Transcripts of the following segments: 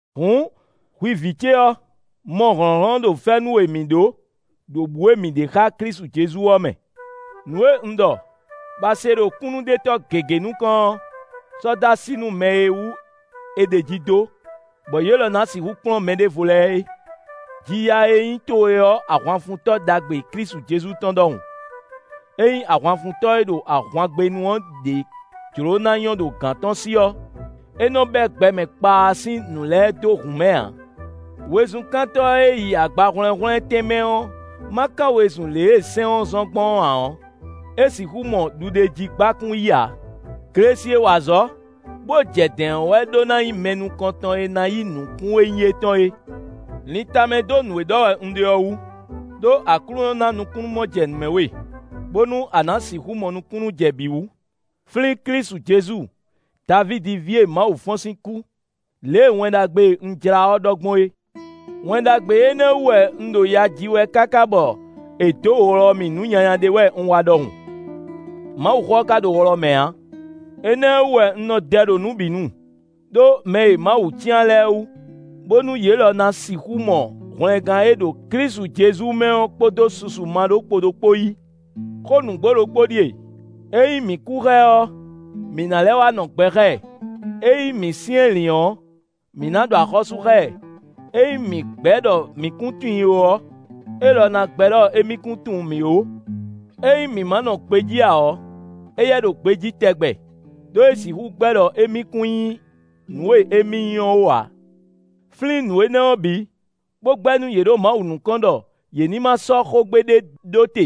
Hǔn, hwi vǐ ce ɔ́, mɔ hlɔ̌nhlɔ́n ɖo fɛ́nú e mǐ ɖó, ɖo bǔ e mǐ ɖe xá Klísu Jezu ɔ́ mɛ. Nǔ e un ɖɔ, bɔ a se ɖo kúnnuɖetɔ́ gěgé nukɔn ɔ́, sɔ́ dó así nú mɛ e wú è ɖeji dó, bɔ yě lɔ ná sixú kplɔ́n mɛɖěvo lɛ́ɛ é. Ji ya e nyí towe ɔ́ ahwanfuntɔ́ ɖagbe Klísu Jezu tɔn ɖɔhun. Ényí ahwanfuntɔ́ e ɖo ahwangbénu ɔ́ ɖě jló na nyɔ́ ɖo gǎn tɔn sí ɔ́, é nɔ bɛ́ gbɛmɛ kpaa sín nǔ lɛ́ɛ dó hǔn mɛ ǎ. Wezunkántɔ́ e yi agbahwlɛ́nhwlɛ́n tɛnmɛ ɔ́ ma kán wezun lě e sɛ́n ɔ́ zɔ́n gbɔn ɔ́ ǎ ɔ́, é sixú mɔ ɖuɖéjígbákún yí ǎ. Glesi e wa azɔ̌, bó jɛ dɛ̌n ɔ́ wɛ ɖó ná nyí mɛ nukɔntɔn e ná yí nukún e nyí étɔn é. Lin tamɛ dó nǔ e ɖɔ wɛ un ɖe ɔ́ wú, ɖó Aklúnɔ ná nukúnnú-mɔjɛnǔmɛ we, bónú a nǎ sixú mɔ nukúnnú jɛ bǐ wú. Flín Klísu Jezu Davídi ví e Mawu fɔ́n sín kú, lě e Wɛn Ɖagbe e un jlá ɔ́ ɖɔ gbɔn é. Wɛn Ɖagbe énɛ́ wú wɛ un ɖo ya ji wɛ káká bɔ è dǒ wlɔ mì nǔ nyanya ɖé wɛ un wa ɖɔhun; Mawuxó ɔ́ ka ɖo wlɔ mɛ ǎ. Énɛ́ wú wɛ un nɔ dɛ ɖo nǔ bǐ nu, ɖó mɛ e Mawu cyán lɛ́ɛ wú, bónú yě lɔ ná sixú mɔ hwlɛngán e ɖo Klísu Jezu mɛ ɔ́ kpódó susu maɖókpodó kpó yí. Xó nǔgbó ɖokpó ɖíe: “Ényí mǐ kú xá ɛ ɔ́, mǐ ná lɛ́ wá nɔ gbɛ xá ɛ. Ényí mǐ syɛ́nlǐn ɔ́, mǐ ná ɖu axɔ́sú xá ɛ. Ényí mǐ gbɛ́ ɖɔ mǐ kún tunwun i ó ɔ́, élɔ́ ná gbɛ́ ɖɔ émí kún tunwun mǐ ó. Ényí mǐ ma nɔ gbejí ǎ ɔ́, éyɛ́ ɖo gbejí tɛgbɛ; ɖó é sixú gbɛ́ ɖɔ émí kún nyí nǔ e émí nyí ɔ́ ó ǎ.” Flín nǔ énɛ́ ɔ́ bǐ, bó gbɛ́ nú yě ɖo Mawu nukɔn ɖɔ yě ní ma sɔ́ xógbe ɖé ɖó te,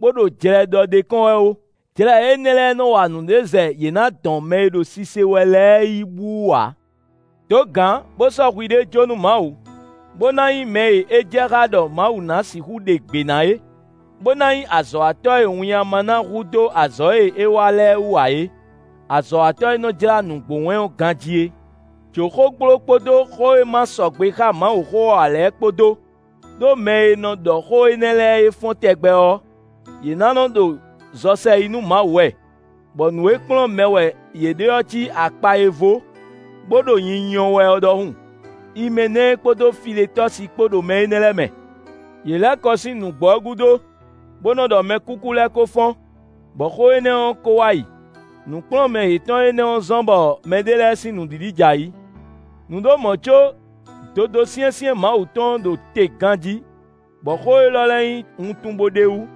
bó ɖo jlɛ ɖɔ ɖ'é kɔn wɛ ó. Jlɛ énɛ́ lɛ́ɛ nɔ wa nǔɖé zɛ yě ná dɔn mɛ e ɖo sise wɛ lɛ́ɛ yi bú wú ǎ. Dǒ gǎn bó sɔ́ hwiɖée jó nú Mawu, bó ná nyí mɛ e é jɛ xá ɖɔ Mawu ná sixú ɖe gbě ná é, bó ná nyí azɔ̌watɔ́ e winnyá ma ná hu dó azɔ̌ e é wa lɛ́ɛ wú ǎ é; azɔ̌watɔ́ e nɔ jlá nǔgbó wɛn ɔ́ ganjí é. Jǒ xógbló kpódó xó e ma sɔgbe xá Mawuxó ɔ́ ǎ lɛ́ɛ kpó dó; ɖó mɛ e nɔ ɖɔ xó énɛ́ lɛ́ɛ é fɔ́n tɛgbɛ ɔ́, yě ná nɔ ɖo zɔ sɛ yi nú Mawu wɛ; bɔ nǔ e kplɔ́n mɛ wɛ yě ɖe ɔ́ cí akpa e vó, bó ɖo nyinyɔ wɛ ɔ́ ɖɔhun. Imɛnɛ́ɛ kpódó Filetɔ́si kpó ɖo mɛ énɛ́ lɛ́ɛ mɛ. Yě lɛ́ kɔ sín nǔgbó ɔ́ gúdo, bó nɔ ɖɔ mɛkúkú lɛ́ɛ ko fɔ́n, bɔ xó énɛ́ ɔ́ ko wá yi. Nǔkplɔ́nmɛ yětɔn énɛ́ ɔ́ zɔ́n bɔ mɛɖé lɛ́ɛ sín nǔɖiɖi jɛ ayǐ. Nǔ ɖo mɔ̌ có dodó syɛ́nsyɛ́n Mawu tɔn ɔ́ ɖo te ganjí, bɔ xó élɔ́ lɛ́ɛ nyí wuntun bó ɖ'é wú: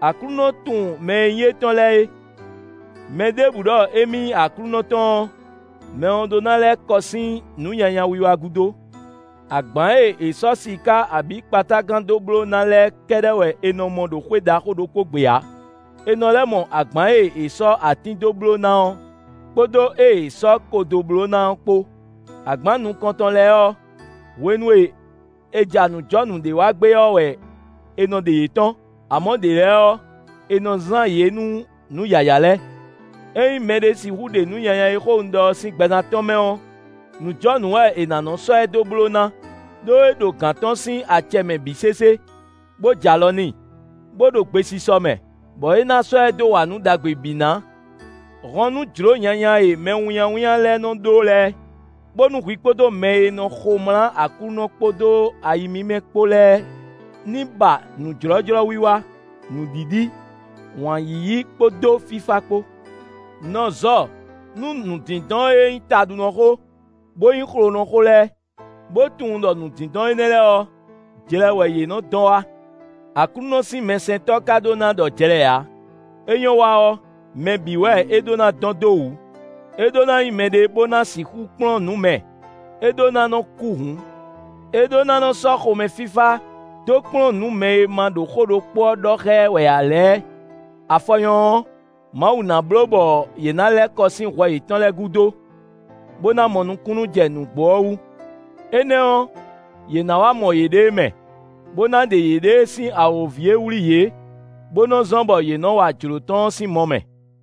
“Aklúnɔ tunwun mɛ e nyí étɔn lɛ́ɛ é!” “Mɛ ɖěbǔ ɖɔ émí nyí Aklúnɔ tɔn ɔ́, mɛ ɔ́ ɖó ná lɛ́ kɔ sín nǔ nyanya wiwa gúdo.” Agbǎn e è sɔ́ siká abǐ kpatágan dó bló ná lɛ́ɛ kɛ́ɖɛ́ wɛ è nɔ mɔ ɖo xwé ɖaxó ɖokpó gbe ǎ; è nɔ lɛ́ mɔ agbǎn e è sɔ́ atín dó bló ná ɔ́ kpódó ée è sɔ́ ko dó bló ná ɔ́ kpó. Agbǎn nukɔntɔn lɛ́ɛ ɔ́, hwenu e è ja nǔjɔnǔ ɖé wa gbé ɔ́ wɛ è nɔ ɖe yě tɔ́n; amɔ̌ ɖě lɛ́ɛ ɔ́, è nɔ zán yě nú nǔ yǎyá lɛ́ɛ. Ényí mɛɖé sixú ɖe nǔ nyanya e xó un ɖɔ ɔ́ sín gbɛzán tɔn mɛ ɔ́, nǔjɔnǔ wɛ è nǎ nɔ sɔ́ ɛ dó bló ná ɖó é ɖo gǎn tɔn sín acɛ mɛ bǐ sésé, bó jɛ alɔ n'i, bó ɖo gbesisɔ mɛ, bɔ é ná sɔ́ ɛ dó wa nǔ ɖagbe bǐ ná. Hɔn nú jlǒ nyanya e mɛwínnyáwínnyá lɛ́ɛ nɔ ɖó lɛ́ɛ, bónú hwi kpódó mɛ e nɔ xomlá Aklúnɔ kpódó ayi mímɛ́ kpó lɛ́ɛ ní ba nǔjlɔ́jlɔ́wiwa, nǔɖiɖi, wǎn yíyí kpódó fífá kpó. Nɔ zɔ nú nǔdindɔn e nyí taɖunɔ xó, bó nyí xlonɔ xó lɛ́ɛ; bo tunwun ɖɔ nǔdindɔn énɛ́ lɛ́ɛ ɔ́, jlɛ wɛ yě nɔ dɔn wá. Aklúnɔ sín mɛsɛntɔ́ ka ɖó ná ɖɔ jlɛ ǎ; é nyɔ́ wa ɔ́, mɛ bǐ wɛ é ɖó ná dɔn dó wǔ; é ɖó ná nyí mɛɖé bó ná sixú kplɔ́n nǔ mɛ; é ɖó ná nɔ kú hǔn. É ɖó ná nɔ sɔ́ xomɛ fífá dó kplɔ́n nǔ mɛ e ma ɖo xó ɖokpó ɔ́ ɖɔ xá ɛ wɛ ǎ lɛ́ɛ; afɔ nyɔ́ ɔ́, Mawu ná bló bɔ yě ná lɛ́ kɔ sín hwɛ yětɔn lɛ́ɛ gúdo, bó ná mɔ nukúnnú jɛ nǔgbó ɔ́ wú. Énɛ́ ɔ́, yě ná wá mɔ yěɖée mɛ, bó ná ɖe yěɖée sín awǒvi e wlí yě, bó nɔ zɔ́n bɔ yě nɔ wa jlǒ tɔn ɔ́ sín mɔ mɛ.